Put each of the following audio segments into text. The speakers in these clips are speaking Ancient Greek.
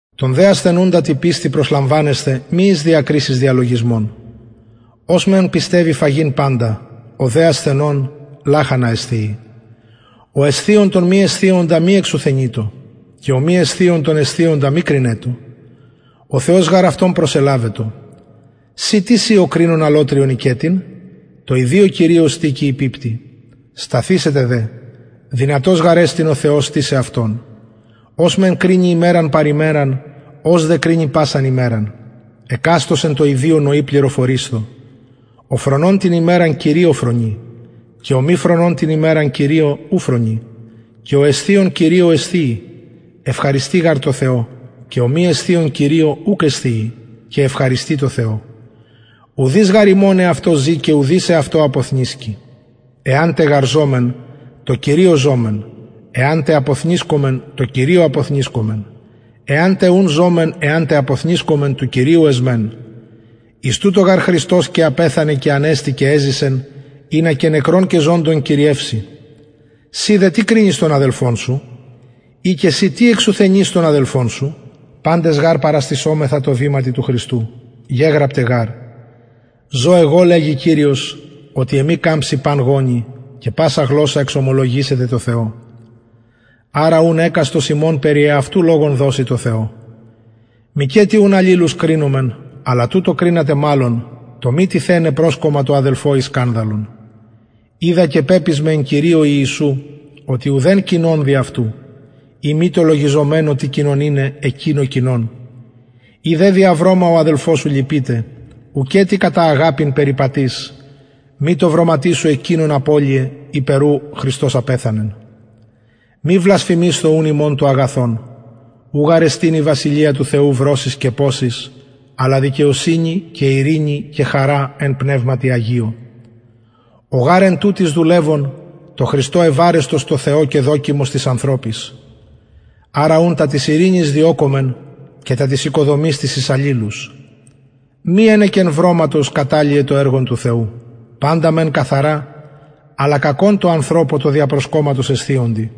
τον δε ασθενουντα τη πιστει προσλαμβανεσθε μη εις διακρισεις διαλογισμων ος μεν πιστευει φαγειν παντα ο δε ασθενων λαχανα εσθιει ο εσθιων τον μη εσθιοντα μη εξουθενειτω και ο μη εσθιων τον εσθιοντα μη κρινετω ο θεος γαρ αυτον προσελαβετο συ τις ει ο κρινων αλλοτριον οικετην τω ιδιω κυριω στηκει η πιπτει σταθησεται δε δυνατος γαρ εστιν ο θεος στησαι αυτον ος μεν κρινει ημεραν παρ ημεραν ος δε κρινει πασαν ημεραν εκαστος εν τω ιδιω νοι πληροφορεισθω ο φρονων την ημεραν κυριω φρονει και ο μη φρονων την ημεραν κυριω ου φρονει και ο εσθιων κυριω εσθιει ευχαριστει γαρ τω θεω και ο μη εσθιων κυριω ουκ εσθιει και ευχαριστει τω θεω ουδεις γαρ ημων εαυτω ζη και ουδεις εαυτω αποθνησκει εαν τε γαρ ζωμεν τω κυριω ζωμεν εαν τε αποθνησκωμεν τω κυριω αποθνησκομεν εαν τε ουν ζωμεν εαν τε αποθνησκωμεν του κυριου εσμεν εις τουτο γαρ χριστος και απεθανεν και ανεστη και εζησεν ινα και νεκρων και ζωντων κυριευση συ δε τι κρινεις τον αδελφον σου η και συ τι εξουθενεις τον αδελφον σου παντες γαρ παραστησομεθα τω βηματι του χριστου γεγραπται γαρ ζω εγω λεγει κυριος οτι εμοι καμψει παν γονυ και πασα γλωσσα εξομολογησεται τω θεω αρα ουν εκαστος ημων περι εαυτου λογον δωσει τω θεω μηκετι ουν αλληλους κρινωμεν αλλα τουτο κρινατε μαλλον το μη τιθεναι προσκομμα τω αδελφω η σκανδαλον οιδα και πεπεισμαι εν κυριω ιησου οτι ουδεν κοινον δι αυτου ει μη τω λογιζομενω τι κοινον ειναι εκεινω κοινον ει δε δια βρωμα ο αδελφος σου λυπειται ουκετι κατα αγαπην περιπατεις μη τω βρωματι σου εκεινον απολλυε υπερ ου χριστος απεθανεν μη βλασφημεισθω ουν υμων το αγαθον ου γαρ εστιν η βασιλεια του θεου βρωσις και ποσις αλλα δικαιοσυνη και ειρηνη και χαρα εν πνευματι αγιω ο γαρ εν τουτοις δουλευων τω χριστω ευαρεστος τω θεω και δοκιμος τοις ανθρωποις αρα ουν τα της ειρηνης διωκωμεν και τα της οικοδομης της εις αλληλους μη ενεκεν βρωματος καταλυε το εργον του θεου παντα μεν καθαρα αλλα κακον τω ανθρωπω τω δια προσκομματος εσθιοντι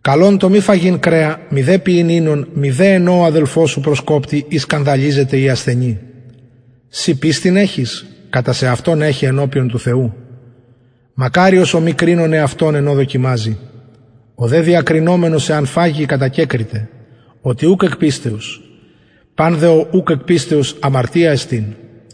καλον το μη φαγειν κρεα μηδε πιειν οινον μηδε εν ω ο αδελφος σου προσκοπτει η σκανδαλιζεται η ασθενει συ πιστιν εχεις κατα σεαυτον εχε ενωπιον του θεου μακαριος ο μη κρινων εαυτον εν ω δοκιμαζει ο δε διακρινομενος εαν φαγη κατακεκριται οτι ουκ εκ πιστεως παν δε ο ουκ εκ πιστεως αμαρτια εστιν